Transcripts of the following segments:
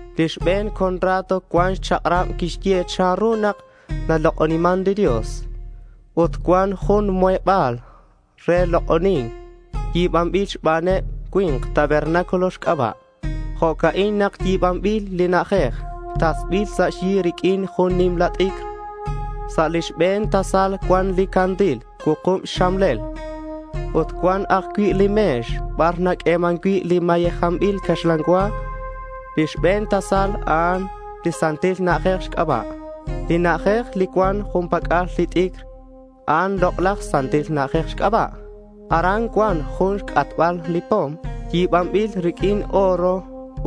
Li xbe̱n contrato cuan xchak'rab naxye chanru nak nalok'oniman li Dios ut cuan jun li muheba̱l re lok'oni̱nc yi̱banbil xbaneb li cui̱nk tabernáculo xc'aba'. Jo'ca'in nak yi̱banbil li na'ajej. Tasbil sa' xyi riq'uin jun nimla t'icr. Sa' li xbe̱n tasal cuan li candil cuukub xxamlel ut cuan ajcui' li me̱x bar naq'ueman cui' li mayejanbil caxlan cua. Li xbe̱n tasal a'an Santil Na'ajej xc'aba'. Li na'ajej li cuan jun pac'al li t'icr, a'an Lok'laj Santil Na'ajej xc'aba'. Aran cuan jun xc'atbal li pom yi̱banbil riq'uin oro,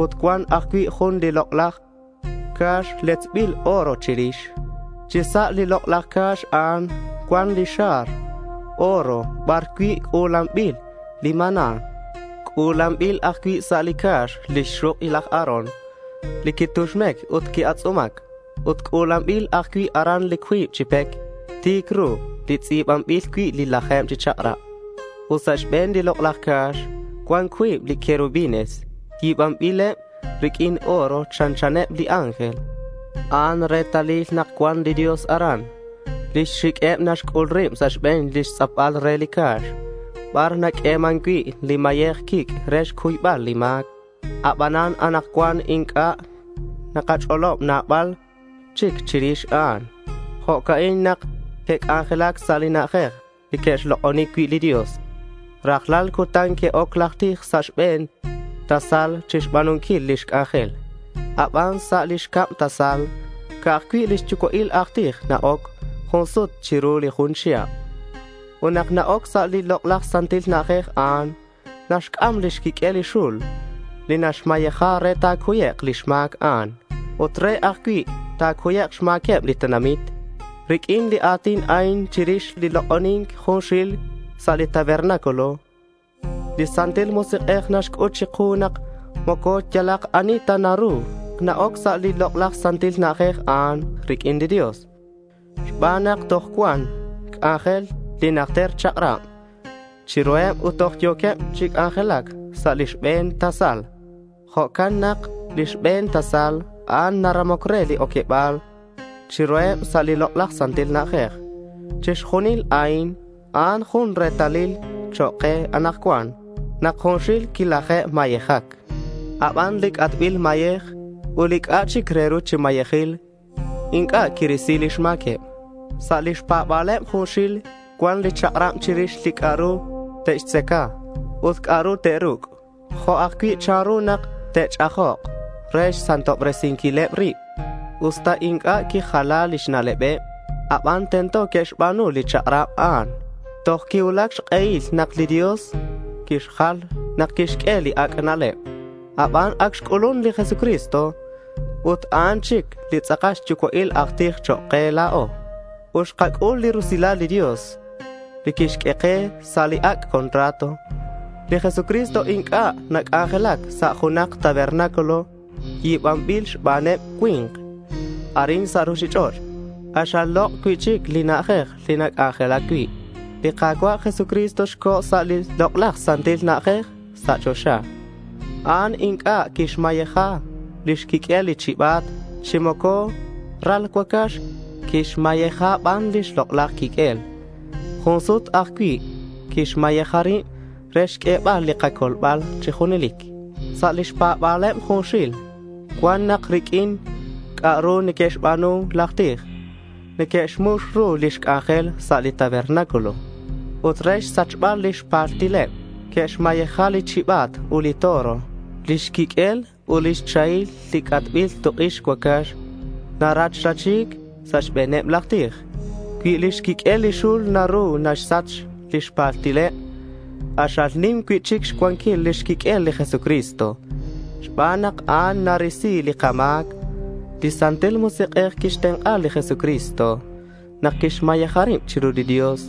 ut cuan ajcui' jun li Lok'laj Ca̱x letzbil oro chirix. Chi sa' li Lok'laj Ca̱x a'an cuan li xar oro bar cui' c'u̱lanbil li maná. C'u̱lanbil ajcui' sa' li ca̱x lix xuk' laj Aarón li quituxmec ut qui-atz'umac. Ut c'u̱lanbil ajcui' aran li cuib chi pec ti̱c ru li tz'i̱banbil cui' li laje̱b chi chak'rab. Ut sa' xbe̱n li Lok'laj Ca̱x cuan cuib li querubines yi̱banbileb riq'uin oro chanchaneb li ángel. A'an retalil nak cuan li Dios aran. Lix xiq'ueb naxc'ul rib sa' xbe̱n lix tz'apbal re li ca̱x bar naq'ueman cui' li mayej quic' re xcuybal li ma̱c. Abanan anakcuan inc'a' takach'olob nabal chic chirix a'an. Jo'ca'in nak que'c'anjelac sa' li na'ajej li que'xlok'oni cui' li Dios. Rajlal cutan que'oc laj tij sa' li xbe̱n tasal chixba̱nunquil lix c'anjel. Aban sa' lix cab tasal ca'aj cui' li xyucua'il aj tij na-oc jun sut chiru li jun chihab. Ut nak na-oc sa' li Lok'laj Santil Na'ajej a'an, naxc'am xquiq'uel li xul ut naxmayeja re ta̱cuyek' lix ma̱c a'an ut re ajcui' nak ta̱cuyek' xma̱queb li tenamit. Riq'uin li a̱tin a'in, chirix li lok'oni̱nc junxil sa' li tabernáculo, li Santil Musik'ej naxc'ut chiku nak moco yalak ani ta naru na-oc toj chi sa' li Lok'laj Santil Na'ajej riq'uin li Dios xban nak toj cuan xc'anjel li najter chak'rab chiruheb ut toj yo̱queb chi c'anjelac sa' li xbe̱n tasal. Jo'can nak li xbe̱n tasal a'an naramoc re li oqueba̱l chiruheb sa' li Lok'laj Santil Na'ajej. Chixjunil a'in, a'an jun retalil chok' ke anakcuan nak junxil quilaje'mayejac. Aban li c'atbil mayej ut li c'a'ak chic re ru chi mayejil inc'a' quirisi lix ma̱queb. Sa' lix pa̱ba̱leb junxil cuan li chak'rab chirix li c'a'ru te'xtzaca ut c'a'ru te'ruc' jo' ajcui' chanru nak te'ch'ajok re xsantobresinquileb rib. Usta inc'a' quijala lix na'lebeb, aban tento que'xba̱nu li chak'rab a'an toj quicuulac xk'ehil nak li Dios quixjal nak quixq'ue li ac' na'leb. Aban ac xc'ulun li Jesucristo ut a'an chic li tz'akal xyucua'il aj tij chok' ke la̱o. Ut xkac'ul li rusilal li Dios li quixq'ue ke sa' li ac' contrato. Li Jesucristo inc'a' nac'anjelac sa' junak tabernáculo yi̱banbil xbaneb li cui̱nk arin sa' ruchich'och'. K'axal lok' cui'chic li na'ajej li nac'anjelac cui'. Li Ka̱cua' Jesucristo co̱ sa' li Lok'laj Santil Na'ajej sa' choxa. A'an inc'a' quixmayeja xquiq'uel li chiba̱t chi moco ral cuacax. Quixmayeja ban lix lok'laj quiq'uel. Jun sut ajcui' quixmayeja rib re xq'uebal li kacolbal chi junelic. Sa' lix pa̱ba̱leb junxil cuan nak riq'uin li c'a'ru neque'xba̱nu laj tij, neque'xmux ru lix c'anjel sa' li tabernáculo. Ut re xsachbal lix paltileb que'xmayeja li chiba̱t ut li toro. Lix quiq'uel ut lix chahil li c'atbil tuk' ix cuacax narachrachi̱c sa' xbe̱neb laj tij. Cui lix quiq'uel li xul naru naxsach lix paltileb, k'axal nim cui'chic xcuanquil lix quiq'uel li Jesucristo xban nak a'an narisi li kama̱c. Li Santil Musik'ej quixtenk'a li Jesucristo nak quixmayeja rib chiru li Dios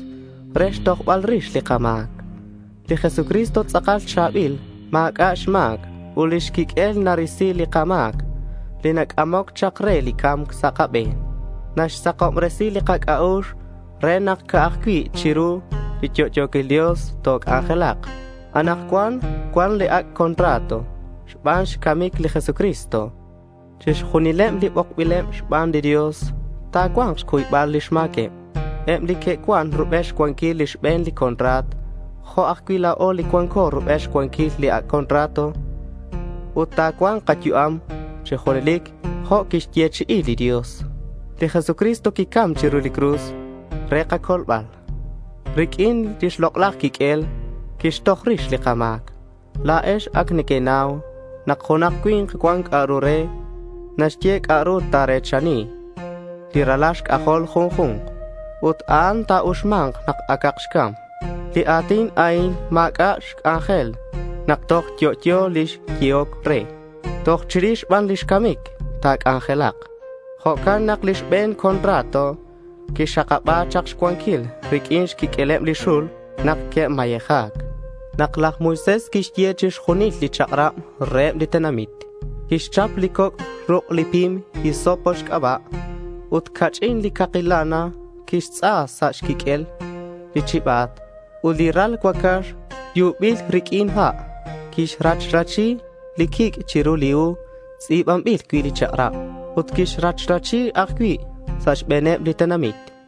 re xtojbal rix li kama̱c. Li Jesucristo tz'akal cha̱bil. Ma̱c'a' xma̱c ut lix quiq'uel narisi li kama̱c li nac'amoc chak re li ca̱mc sa' kabe̱n. Naxsakobresi li kac'a'ux re nak ca'aj cui' chiru li yo'yo̱quil Dios toc'anjelak. Anakcuan cuan li ac' contrato xban xcamic li Jesucristo. Chixjunileb li bokbileb xban li Dios ta̱cua̱nk xcuybal lix ma̱queb, eb li que'cuan rubel xcuanquil li xbe̱n contrato jo' ajcui' la̱o li cuanco rubel xcuanquil li ac' contrato. Ut ta̱cua̱nk kayu'am chi junelic jo' quixyechi'i li Dios. Li Jesucristo quicam chiru cruz re kacolbal. Riq'uin lix lok'laj quiq'uel quixtoj rix li kama̱c. La̱ex ac nequenau nak junak cui̱nk cuan c'a'ru re naxye c'a'ru ta̱re̱chani li ralal xc'ajol junju̱nk. Ut a'an ta̱uxma̱nk nak acak xcam. Li a̱tin a'in ma̱c'a' xc'anjel nak toj yo'yo li xyehoc re. Toj chirix ban lix camic ta̱c'anjelak. Jo'can nak li xbe̱n contrato quixakaba̱c chak xcuanquil riq'uin xquiq'ueleb li xul nak que'mayeja̱c. Nak laj Moisés quixye chixjunil li chak'rab reheb li tenamit, quixchap li coc' ruk' li pim hisopo xc'aba' ut ca'ch'in li caki lana. Quixtz'a sa' xquiq'uel li chiba̱t ut li ral cuacax yubil riq'uin ha'. Quixrachrachi li quic' chiru li hu tz'i̱banbil cui' li chak'rab ut quixrachrachi ajcui' sa' xbe̱neb li tenamit.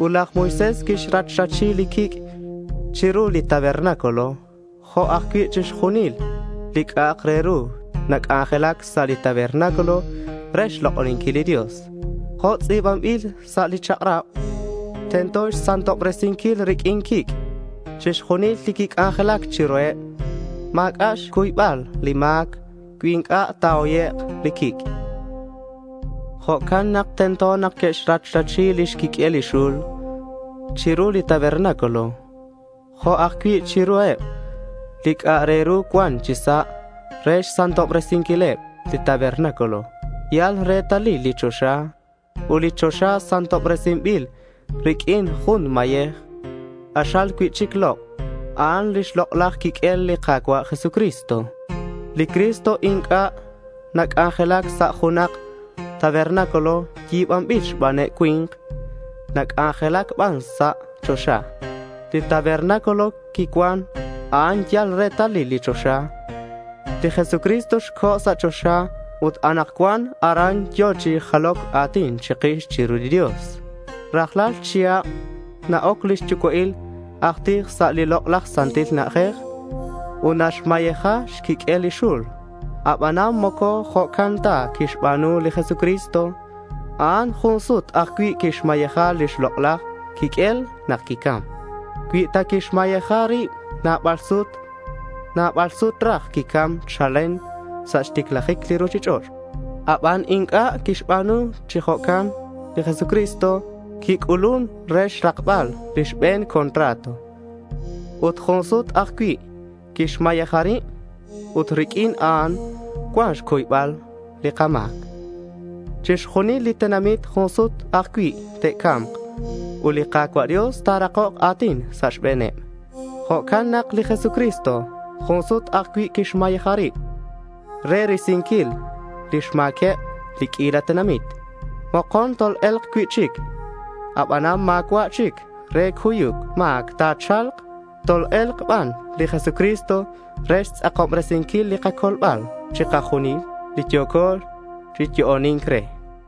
Ut laj Moisés quixrachrachi li quic' chiru li tabernáculo jo' ajcui' chiru chixjunil li c'a'ak re ru nac'anjelac sa' li tabernáculo re xlok'oninquil li Dios. Jo' tz'i̱banbil sa' li chak'rab, tento xsantobresinquil riq'uin quic' chixjunil li quic'anjelac chiruheb. Ma̱c'a' xcuybal li ma̱c cui inc'a' ta̱hoyek' li quic'. Jo'can nak tento nak que'xrachrachi lix quiq'uel li xul chiru li tabernáculo jo' ajcui' chiruheb li c'a' re ru cuan chi sa' re xsantobresinquileb. Li tabernáculo yal retalil li choxa. Ut li choxa santobresinbil riq'uin jun mayej k'axal cui'chic lok'. A'an lix lok'laj quiq'uel li Ka̱cua' Jesucristo. Li Cristo inc'a' nac'anjelac sa' junak tabernáculo yi̱banbil xbaneb li cui̱nk. Nac'anjelac ban sa' choxa. Li tabernáculo quicuan, a'an yal retalil li choxa. Li Jesucristo co̱ sa' choxa ut anakcuan aran yo̱ chi jaloc a̱tin chikix chiru li Dios. Rajlal chihab na-oc lix yucua'il aj tij sa' li Lok'laj Santil Na'ajej ut naxmayeja xquiq'uel li xul. Aban moco jo'can ta quixba̱nu li Jesucristo. A'an jun sut ajcui' quixmayeja lix lok'laj quiq'uel nak quicam. Cui ta quixmayeja rib nabal sut, nabal sut raj quicam chalen sa' xticlajic li ruchich'och'. Aban inc'a' quixba̱nu chi jo'can. Li Jesucristo quic'ulun re xrakbal li xbe̱n contrato ut jun sut ajcui' quixmayeja rib. Ut riq'uin a'an cuan xcuybal li ma̱c. Chixjunil li tenamit jun sut ajcui' te'ca̱mk ut li Ka̱cua' Dios ta̱rakok a̱tin sa' xbe̱neb. Jo'can nak li Jesucristo jun sut ajcui' quixmayeja rib re risinquil lix ma̱queb li q'uila tenamit. Mokon tol-e̱lk cui'chic, aban ma̱cua' chic re cuyuc ma̱c ta̱cha̱lk. Tol-e̱lk ban li Jesucristo re xtz'akobresinquil li kacolbal chikajunil li yo̱co chi yo'oni̱nc re.